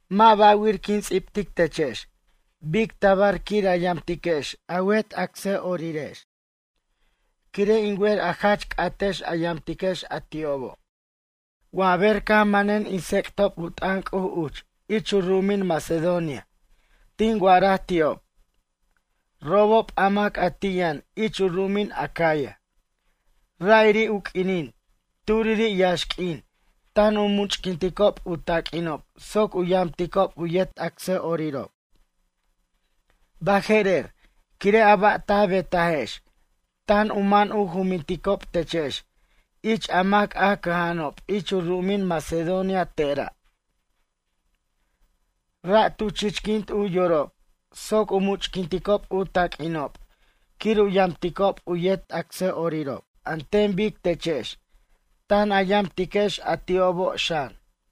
Mʌ' ba'wir quin ts'ibtic techex bic tabar quir a yamtiquex a wet acsa'orirex. Quire' in wer a jach c'atex a yamtiquex a ti'obo'. Wa ber caj manen in tsec'tob u t'ʌn C'uj uch ich u ru'umin Macedonia tin wa'araj ti'ob: “Robob a mac a ti' yʌn ich u ru'umin Acaya, ra'iri' u q'uinin turiri' yaxq'uin tan u much'quinticob u taq'uinob soc u yamticob u yet acsa'orirob.” Baje'rer, quire' a ba' ta betajex tan u man u juminticob techex ich a mac a cʌja'anob ich u ru'umin Macedonia tera'. Ra' tu chichquint u yorob soc u much'quinticob u taq'uinob quir u yamticob u yet acsa'orirob an ten bic techex tan a yamtiquex a ti'obo' xan.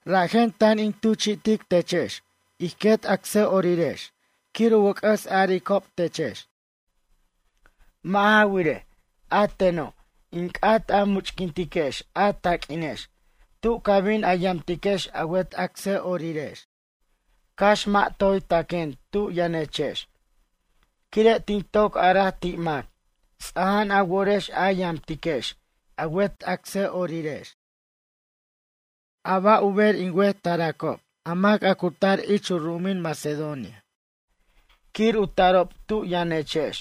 Rajen tan in tuchi'tiquechex ij quet acsa'orirex quir u wʌc'ʌs aricob techex. Mʌ' ja wirej, a teno' in c'at a much'quintiquex a taq'uinex tu ca bin a yamtiquex a wet acsa'orirex cax mʌ' toy taquen tu yʌnechex quire' tin toc araj ti' mac ts'aja'an a worex a yamtiquex a wet acsa'orirex. A ba' u ber in wet taracob a mac a cu tar ich u ru'umin Macedonia quir u tarob tu yʌnechex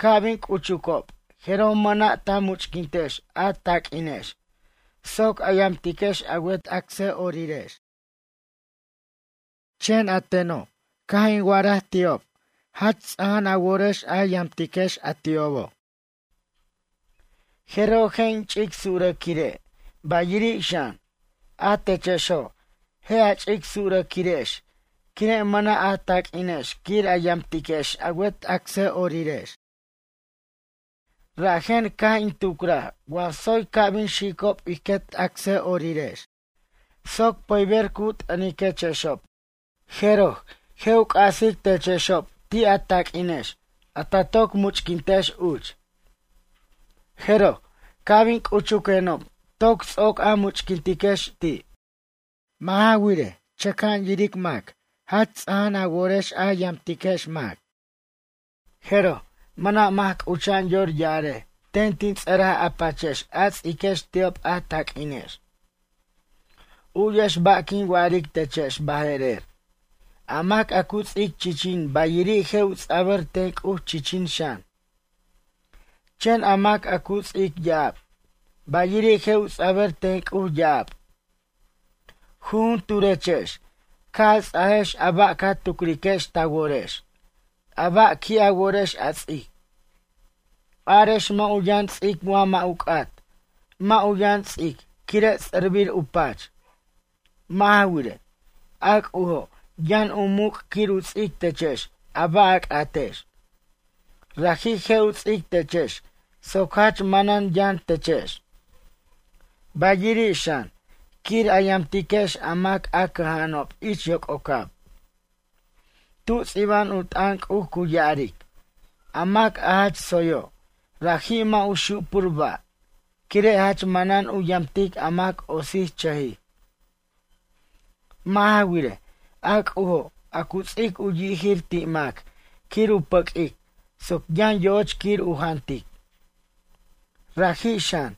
ca' bin c'uchucob jeroj mʌna' ta much'quintex a taq'uinex soc a yamtiquex a wet acsa'orirex. Chen a teno' caj in wa'araj ti'ob jach ts'aja'an a worex a yamtiquex a ti'obo'. Jeroj je' in ch'ic surʌquire', bayiri' xan, a techexo' je' a ch'ic surʌquirex quire' mʌna' a taq'uinex quir a yamtiquex a wet acsa'orirex. Rajen caj in tucraj wa tsoy ca' bin xicob ij quet acsa'orirex soc pʌyber cu t'ʌniquechexob. Jeroj, je' u c'asic techexob ti' a taq'uinex a ta toc much'quintex uch. Jeroj, ca' bin c'uchuquenob toc ts'oc a much'quintiquex ti'. Mʌ' ja wirej, chʌca'an yiric mac jach ts'aja'an a worex a yamtiquechex mac. Jeroj, mʌna' mac c'ucha'an yor ya'arej ten tin ts'ʌraj a pachex a ts'iquex ti'ob a taq'uinex. U'yex ba' quin wa'aric techex baje'rer. A mac a cu ts'ic chichin bayiri' je' u ts'abʌr ten C'uj chichin xan. Chen a mac a cu ts'ic ya'ab, bayiri' je' u ts'abʌr ten C'uj ya'ab. Jujunturechex ca' a ts'ajex a ba' ca tucriquex ta worex, a ba' qui' a worex a ts'ic. Arex mʌ' u yʌn ts'ic wa mʌ' u c'at, mʌ' u yʌn ts'ic quire' tsʌrbir u pach. Mʌ' ja wirej, a C'ujo' yʌn u muc' quir u ts'ic techex a ba' a c'atex. Raji' je' u ts'ic techex soc jach manan yʌn techex. Bayiri' xan, quir a yamtiquechex a mac a cʌja'anob ich yoc'ocab. Tu ts'iba'an u t'ʌn C'uj cu ya'aric: A mac a jach tsoyo', raji' mʌ' u xupur ba', quire' jach manan u yamtic a mac otsichʌjij. Mʌ' ja wirej, a C'ujo' a cu ts'ic u yijir ti' mac quir u pʌq'uic soc yʌn yo'och quir u jantic. Raji' xan,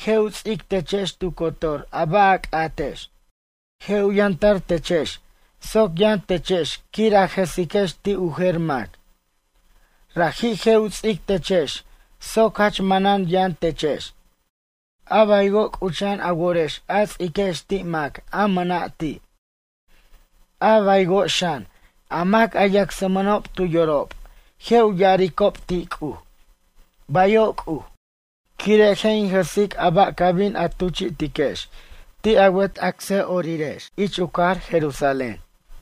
je' u ts'ic techex tu cotor a ba' a c'atex. Je' u yʌntar techex soc yʌn techex quir a jʌsiquex ti' u jer mac. Raji' je' u ts'ic techex soc jach manan yʌn techex, a baywo' c'ucha'an a worex a ts'iquex ti' mac a mʌna' ti'. A baywo' xan, a mac a yacsmʌnob tu yorob je' u ya'aricob ti' C'uj: “Bayo' C'uj”, quire' je' in jʌsic a ba' ca bin a tuchi'tiquex ti' a wet acsa'orirex ich u cajar Jerusalén.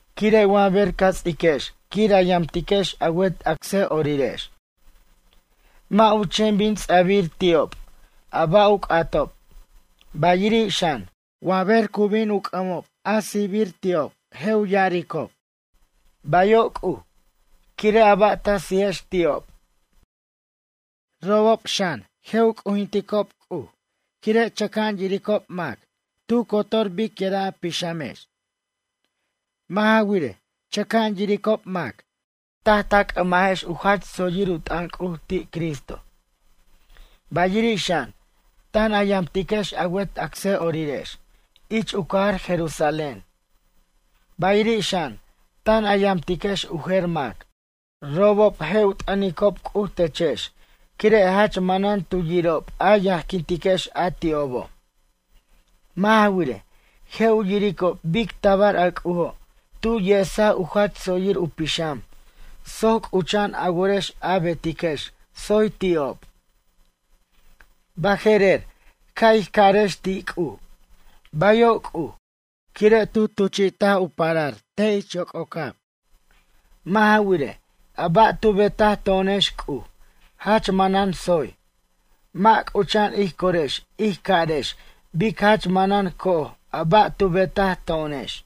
Quire' wa ber ca ts'iquex quir a yamtiquex a wet acsa'orirex, mʌ' u chen bin ts'a'bir ti'ob a ba' u c'atob, bayiri' xan, wa ber cu bin u c'ʌmbirob a sijbir ti'ob je' u ya'aricob: “Bayo' C'uj”, quire' a ba' ta sijex ti'ob. Robob xan, je' u c'ujinticob C'uj quire' chʌca'an yiricob mac tu cotor biquira' a pixamex. Mʌ' ja wirej, chʌca'an yiricob mac taj ta c'ʌmajex u jach tsoyir u t'ʌn C'uj ti' Cristo. Bayiri' xan, tan a yamtiquex a wet acsa'orirex ich u cajar Jerusalén, bayiri' xan tan a yamtiquex u jer mac. Robob je' u t'ʌnicob C'uj techex quire' jach manan tu yirob a yajquintiquex a ti'obo'. Mʌ' ja wirej, je' u yiricob bic tabar a C'ujo' tu yesaj u jach tsoyir u pixam soc c'ucha'an a worex a betiquex tsoy ti'ob. Baje'rer ca' ij carex ti' C'uj: “Bayo' C'uj”, quire' tu tuchi't u parar te' ich yoc'ocab. Mʌ' ja wirej, a ba' tu betaj to'onex C'uj jach manan tsoy. Mʌ' c'ucha'an ij corex ij carex bic jach manan co'oj a ba' tu betaj to'onex.